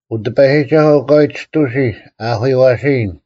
ᐅ ᑎᐸᔨᒋᒐᓱᐤ, ᐊᑲᐎᔾ ᒋᑐᓯ ᐊ ᐊᐧᑯᔪᐛᓯᔨᓐ;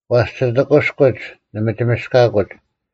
ᐛᔅ ᒋᑦ ᐊᑭᔎᒡ ᓂ ᒥᒋᒥᔅᑲᑯᒡ,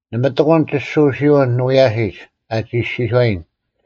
ᓇᒪ ᑎᑯᓐ ᒋᓱᓯᐅᓐ ᓂ ᐎᔭᓯᒡ, ᐊ ᒋᔄᓯᔨᓐ;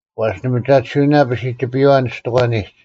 ᐛᔅ ᓂᒥᒐᑎᓯᐅᓇ ᐸᓯᒋᐱᔪᐛ ᓂᔅᑎᒂᓂᒡ: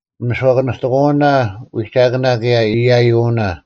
ᓂᒥᔄᑭᓂᑲᑎᑯᐅᓇ ᐎᒐᑭᓇ ᑭᔭ ᐃᔭᔪᐅᓇ,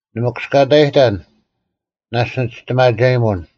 ᓂ ᒥᑯᔅᑲᑕᔨᑕᓐ; ᓇᔅᒡ ᓂ ᒋᔅᑎᒪᒐᔨᒧᓐ;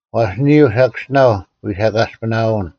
ᐛᔅ ᓂᔪᐤ ᓴᑭᔅᒋᓇᐤ ᐎᓴᑲᔅᐱᓇᐅᓐ;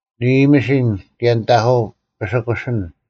ᓂ ᐃᔨᒥᓯᓐ ᑭᔭ ᓂᑦ ᐊᑯ ᐱᑯᓯᓂᓐ: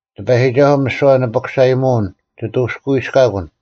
ᑎᐸᔨᒋᒐᓱᐤ, ᒥᓯᐛ ᓂᐱᑯᓴᔨᒧᐅᓐ ᒋᑦ ᐅᑎᔅᑲᐎᔅᑲᑯᓐ;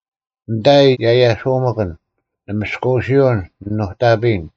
ᓂᑕᐃ ᔭᔭᓱᒪᑭᓐ, ᓂ ᒥᔅᑯᐅᓯᐅᓐ ᓂ ᓄᑕᐱᔨᓐ: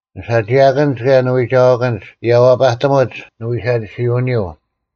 ᓂᓴᒋᐊᑭᓐᒡ ᑭᔭ ᓂᐎᒐᐛᑭᓐᒡ ᔭᐛᐸᑎᒧᒡ ᓂᐎᓴᒋᓯᐅᓂᔪᐤ;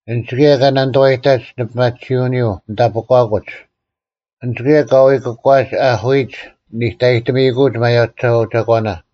ᐊᓐᒡ ᑭᔭ ᑲ ᓇᓂᑐᐛᔨᑕᒡ ᓂᐱᒪᑎᓯᐅᓂᔪᐤ ᓂ ᑕᐱᒂᑯᒡ; ᐊᓐᒡ ᑭᔭ ᑲ ᐎᑯᒂᒡ ᐊᐧᑯᐃᒡ ᓂᑕᔨᒧᑎᒪᑯᒡ ᒪᔭᔨᒐᐤ ᒐᒂᓇ,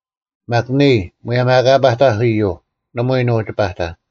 ᒪᒃ ᓂᔾ, ᒧᔭᒻ ᐊ ᐊᑲ ᐸᑕᐧᒃ ᐃᔪᐤ, ᓇᒪᐎᔾ ᓄᒋ ᐸᑕᓐ;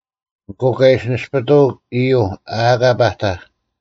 ᐊᑯ ᑲ ᐃᓯ ᓇᔅᐱᑐᐅᒃ ᐃᔪᐤ ᐊ ᐊᑲ ᐸᑕᐧᒃ,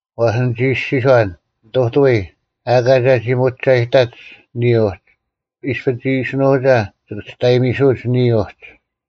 ᐛᔅ ᓂᒋ ᐃᔅᒋᔄᓐ, “ᓂᑐᑐᐎ, ᐊᑲ ᒐᒋ ᒧᒐᔨᑕᒡ ᓂᔾ ᐅᒋ: ᐃᔅᐱ ᒋᐃᓯᓄᒐ, ᒋᑭ ᒋᔅᑕᔨᒥᓱᐅᒡ ᓂᔾ ᐅᒋ᙮”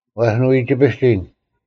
ᐛᔅ ᓂ ᐎ ᒋᐱᒋᓐ,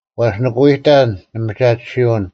ᐛᔅ ᓂᑭ ᐎᑕᓐ ᓂᒥᒐᑎᓯᐅᓐ;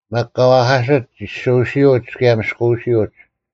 ᒪᒃ ᑲ ᐛᐧᑲᓯᒡ ᒋᓱᓯᐅᒡ ᑭᔭ ᒥᔅᑯᐅᓯᐅᒡ: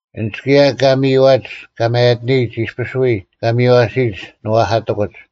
ᐊᓐᒡ ᑭᔭ ᑲ ᒥᔨᐛᒡ ᑲ ᒪᔭᑎᓂᔨᒡ ᐃᔅᐱᔅ ᐎᔾ ᑲ ᒥᔽᓯᔨᒡ ᓂᐛᐧᑲᑎᑯᒡ;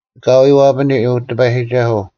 ᐊᑲᐎᔾ ᐛᐱᓂ, ᐅ ᑎᐸᔨᒋᒐᓱᐤ: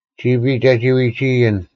ᒋᐱᔾ ᒐᒋ ᐎᒋᐃᔨᓐ,